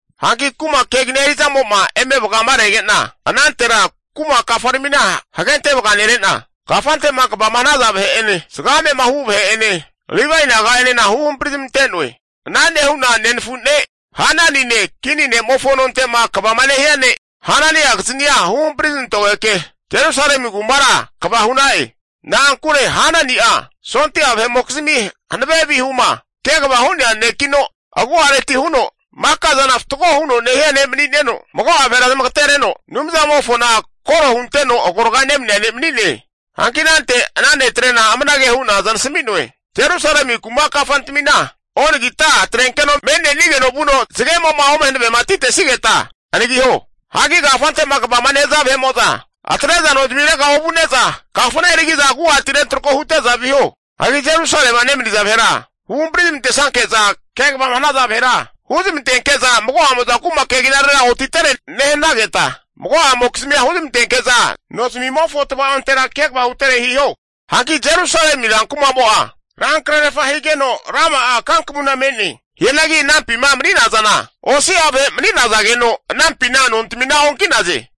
Hanki kuma kegina eri'zamo'ma eme vagarege'na, anantera kuma kafaramina hagente vaganere'na, kafante'ma kvama hanaza vahe'ene zagame'ma hu vahe'ene Livae naga'enena huhampari zamante'noe. Ana nehu'na nenfu ne' Hananine, kini ne'mofo nonte'ma kvama nehia ne' Hanania kiznia huhampari zanantogeke Jerusalemi kumara kegava hu'na'e. Na'ankure Hanania'a sondia vahe'mokizmi hanave vihuma kegava hu'nea ne'kino agu'areti huno maka'zana fatgo huno nehia ne' mani'neno, mago'a vahera zamagatereno Anumzamofona koro hunenteno agorga nemania ne' mani'ne. Hanki anante ana netrena amanage hu'na zanasami'noe, Jerusalemi kuma kafantamina onagita atrenkeno me'nenigeno vuno zagemo'ma hanavema ometitesigeta anagiho. Hagi kafante'ma kegavama nehaza vahe'mo'za atre'za nozamirega ovu'neza kafana erigi'za agu'ati rentrako hute'za viho. Hagi Jerusalema nemaniza vahera huhampri zamantesnanke'za kegavama hanazana vahera huzmantenke'za mago'amo'za kuma keginarera otitere nehanageta mago'amokizmia huzmantenke'za nozamimofo tva'ontera kegava hutere hiho. Hanki Jerusalemi rankuma'mo'a rankrefa higeno rama'a kankamuna me'ne. Hianagi anampima mani'nazana osi'a vahe mani'nazageno, anampina nontamina onki'naze.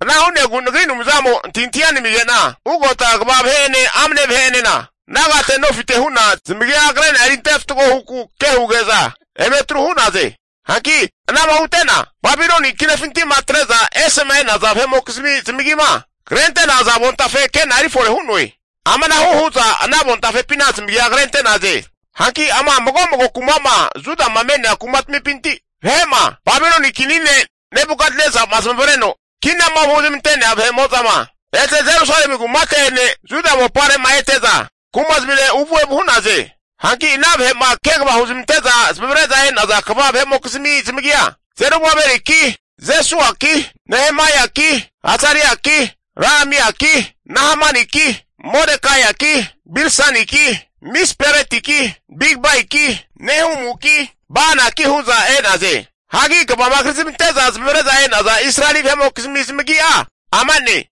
Ana hu'negu nagri Anumzamo antahintahi namige'na, ugota kva vahe'ene amne vahe'enena nagate nofite hu'na zamagia krena erinte fatgo huku ke huge'za eme atru hu'naze. Hanki anama hute'na, Babiloni kinafinti'ma atre'za ese'ma e'naza vahe'mokizmi zamagima krente'naza avontafe kena erifore hu'noe. Amanahu hu'za ana avontafepina zamagia krente'naze. Hanki ama mago mago kuma'ma Judama me'nea kumatmimpinti vahe'ma, Babiloni kini ne' Nebukatnesa'ma zamavareno kinama ome huzmante'nea vahe'mo'zama ete Jerusalemi kumate'ene, Juda moparema ete'za, kuma zamire uvu evu hu'naze. Hanki ana vahe'ma kegava huzmante'za zamavare'za e'naza kva vahe'mokizimi zamagia, Zerubabeliki, Jesuaki, Nehemaiaki, Azariaki, Ra'amiaki, Nahamaniki, Modekaiaki, Bilsaniki, Misperetiki, Bigvaiki, Nehumuki, Ba'anaki hu'za e'naze. Hagi kvama krizmante'za zamavare'za e'naza Israeli vahe'mokizmi zamagi'a ama'ne,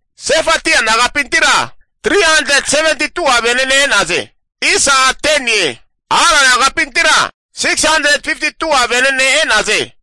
Sefatia nagapintira 372'a venene e'naze. Ara nagapintira 652'a venene e'naze.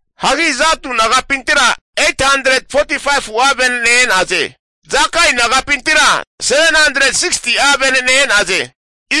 Hagi Zatu nagapintira 845fu'a vene'ne e'naze. Zakai nagapintira 760'a venene e'naze.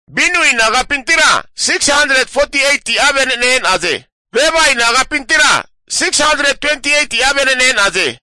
Binui nagapintira 648'a vene'ne e'naze. Bebai nagapintira 628'a venene e'naze.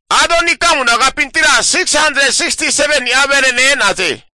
Adonikamu nagapintira 667ni'a venene e'naze.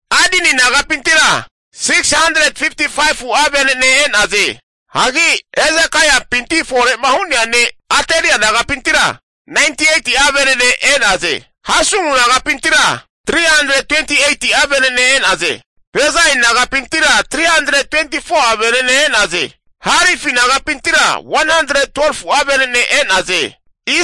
Adini nagapintira 655'a vene'ne e'naze. Hagi Hezekaiampinti fore'ma hu'nea ne' Ateria nagapintira 98'a venene e'naze. Hasumu nagapintira 328'a venene e'naze. Bezai nagapintira 324'a venene e'naze. Harifi nagapintira 112'a vene'ne e'naze.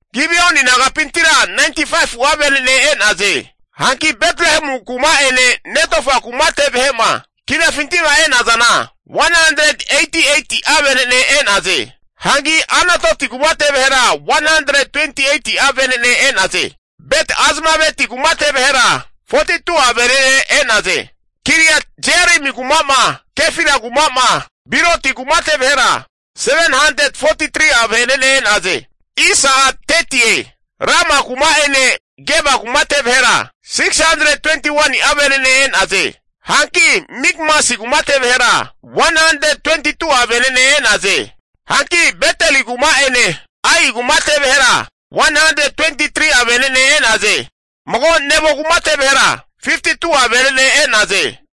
Gibeoni nagapintira 95'a vene'ne e'naze. Hanki Betlehemu kuma'ene Netofa kumate vahe'ma kinafintima e'nazana 188'a vene'ne e'naze. Hanki Anatoti kumate vahera 128'a vene'ne e'naze. Bet-Azmaveti kumate vahera 42'a vene'ne e'naze. Kiriat-Jearimi kuma'ma Kefira kuma'ma Biroti kumate vahera 743'a venene e'naze. Rama kuma'ene Geba kumate vahera 621ni'a vene'ne e'naze. Hanki Mikmasi kumate vahera 122'a venene e'naze. Hanki Beteli kuma'ene Ai kumate vahera 123'a vene'ne e'naze. Mago Nebo kumate vahera 52'a vene'ne e'naze.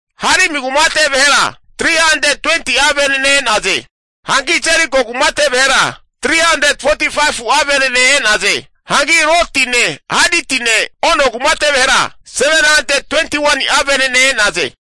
Harimi kumate vahera 320'a vene'ne e'naze. Hanki Jeriko kumate vahera 345'a vene'ne e'naze. Hanki Lotine Haditine Ono kumate vahera 721ni'a venene e'naze.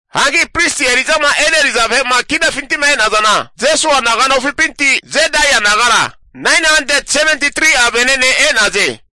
Hanki pristi eri'zama eneriza vahe'ma kinafintima e'nazana, Jesua naga'nofipinti Jedaia nagara 973'a vene'ne e'naze.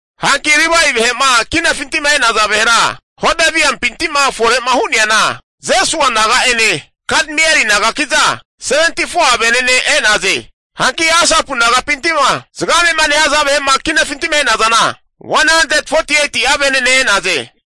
Hanki Livae vahe'ma kinafintima e'naza vahera, Hodaviampintima fore'ma hu'neana Jesua naga'ene Kadmieli nagaki'za 74'a vene'ne e'naze. Hanki Asapu nagapinti'ma zagamema nehaza vahe'ma kinafinti'ma e'nazana 148'a vene'ne e'naze.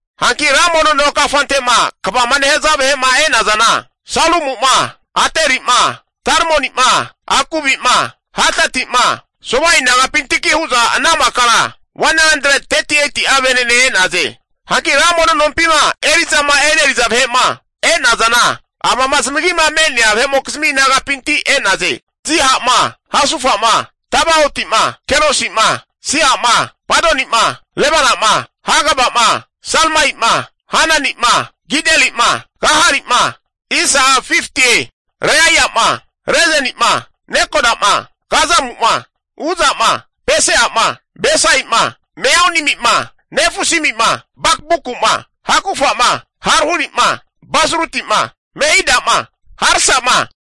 Hanki ra mono no kafante'ma kvama nehaza vahe'ma e'nazana, Salumu'ma Ateri'ma Talmoni'ma Akubi'ma Hatita'ma Sobai nagapintiki hu'za ana makara 138'a vene'ne e'naze. Hanki ra mono nompima eri'zama eneriza vahe'ma e'nazana, amama zamagima me'nea vahe'mokizmi nagapinti e'naze. Ziha'ma, Hasufa'ma, Tabaoti'ma, Kerosi'ma, Sia'ma, Padoni'ma, Lebana'ma, Hagaba'ma, Salmai'ma, Hanani'ma, Gideli'ma, Gahari'ma, Reaia'ma, Rezini'ma, Nekoda'ma, Gazamu'ma, Uza'ma, Pesea'ma, Besai'ma, Meaunimi'ma, Nefusimi'ma, Bakbuku'ma Hakufa'ma Harhuri'ma, Bazluti'ma, Mehida'ma, Harsa'ma,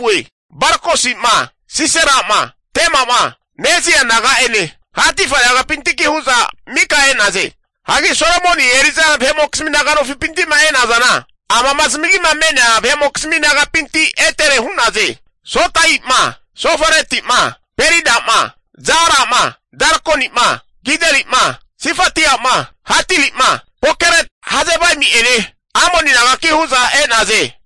Barkosi'ma, Sisera'ma, Tema'ma, Nezia naga'ene Hatifa nagapintiki hu'za mika e'naze. Hagi Solomoni eri'za vahe'mokizmi naga nofipinti'ma e'nazana, amama zamagima me'nea vahe'mokizmi nagapinti etere hu'naze. Sotai'ma Sofereti'ma Perida'ma, Ja'ala'ma, Darkoni'ma, Gideli'ma, Sifatia'ma, Hatili'ma, Pokeret-Hazebaimi e'ne Amoni nagaki hu'za e'naze.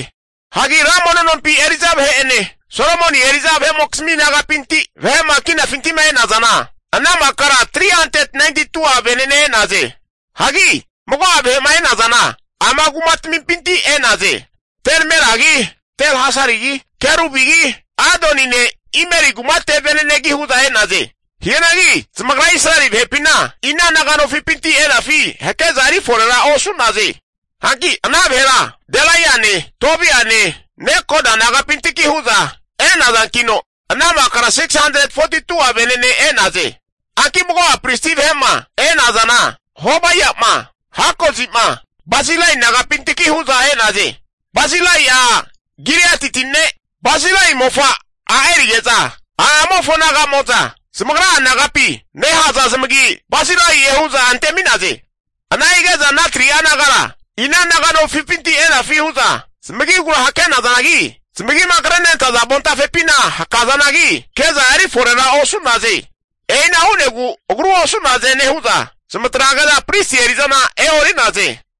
Hagi ra mono nompi eri'za vahe'ene, Solomoni eri'za vahe'mokizmi nagapinti vahe'ma kinafinti'ma e'nazana ana maka 392'a venene e'naze. Hagi mago'a vahe'ma e'nazana ama kumatamimpinti e'naze. Tel-Melagi Tel-Hasarigi Kerubigi Adonine Imeri kumate venenegi hu'za e'naze. Hianagi zamagra Israeli vahepina ina naga nofipinti e'nafi hake'za eriforera osu'naze. Hanki ana vahera Delaiane Tobiane Nekoda nagapintiki hu'za e'nazankino, ana makara 642'a venene e'naze. Hanki mago'a pristi vahe'ma e'nazana, Hobaia'ma Hakozi'ma Bazilai nagapintiki hu'za e'naze. Bazilai'a Giliatiti ne' Bazilai mofa a' erige'za, a'amofo naga'moza zamagra'a nagapi nehaza zamagi Bazilai'e hu'za antemi'naze. Ana hige'za ana 3'a nagara ina naga nofipinti e'nafi hu'za zamagigura hake'nazanagi, zamagima krenentaza avontafepina hakazanagi ke'za eri forera osu'naze. E'ina hu'negu agru osu'naze nehu'za, zamatrage'za pristi eri'zana e'ori'naze.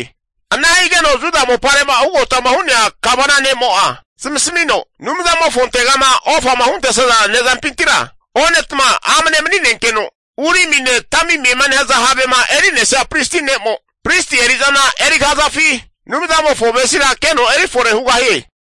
Ana higeno Juda mopare'ma ugotama hu'nea gavana ne'mo'a zamasamino, Anumzamofontegama ofama huntesaza ne'zampintira onetma amne mani'nenkeno, Urimine Tamimiema nehaza havema eri'nesia pristi ne'mo, pristi eri'zana erigahazafi Anumzamofo avesira keno eri fore hugahie.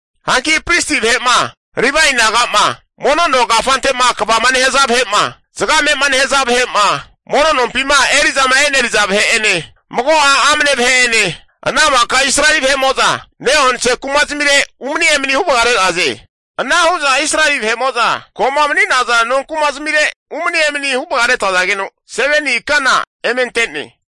Hanki pristi vahe'ma, Livae naga'ma, mono no kafante'ma kvama nehaza vahe'ma, zagame'ma nehaza vahe'ma, mono nompima eri'zama eneri'za vahe'ene, mago'a amne vahe'ene ana maka Israeli vahe'mo'za ne'onse kumazmire umani emani huvagare'naze. Ana hu'za Israeli vahe'mo'za ko'ma mani'naza nonku'ma zamire umani emani huvaga retazageno, 7ni ikana emente'ne.